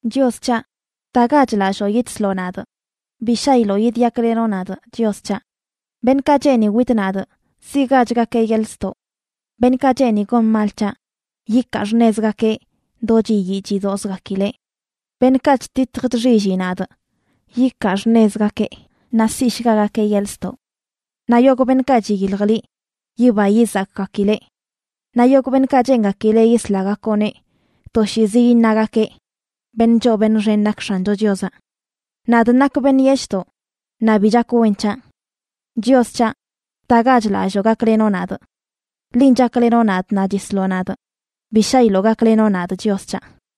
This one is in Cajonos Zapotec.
Chios c̱haꞌ, ¡btagach lalloo, yidsloꞌ nadꞌ! Bi shaꞌiloꞌ yidyaklenoꞌ nadꞌ, Chios c̱haꞌ. Beṉꞌkaꞌ cheeni witꞌ nadꞌ siꞌgachgakeꞌ yeḻꞌ ztoꞌ. Beṉꞌkaꞌ cheeni gon mal c̱haꞌ yikaa xṉezgakeꞌ do chiyii chidozgakileꞌ. Beṉꞌkaꞌ chtitj chxilli nadꞌ yikaa xṉezgakeꞌ naꞌ siꞌshgagakeꞌ yeḻꞌ ztoꞌ. Naꞌ yogꞌ beṉꞌkaꞌ chiyilj liꞌ, yiba yizakgakileꞌ. Naꞌ yogꞌ beṉꞌkaꞌ cheengakileꞌ yislagakoꞌneꞌ toshiizi iṉagakeꞌ: “Beṉꞌ choo beṉꞌ xen nak X̱ancho Chiozaꞌ.” Nadꞌ nakꞌ beṉꞌ yeshꞌdoꞌ, naꞌ bi chak wen c̱haꞌ. Chios c̱haꞌ, btagach lalloo gaklenoꞌ nadꞌ. Linꞌ chaklenoꞌ nadꞌ naꞌ chisloꞌ nadꞌ; bi shaꞌilo gaklenoꞌ nadꞌ, Chios c̱haꞌ.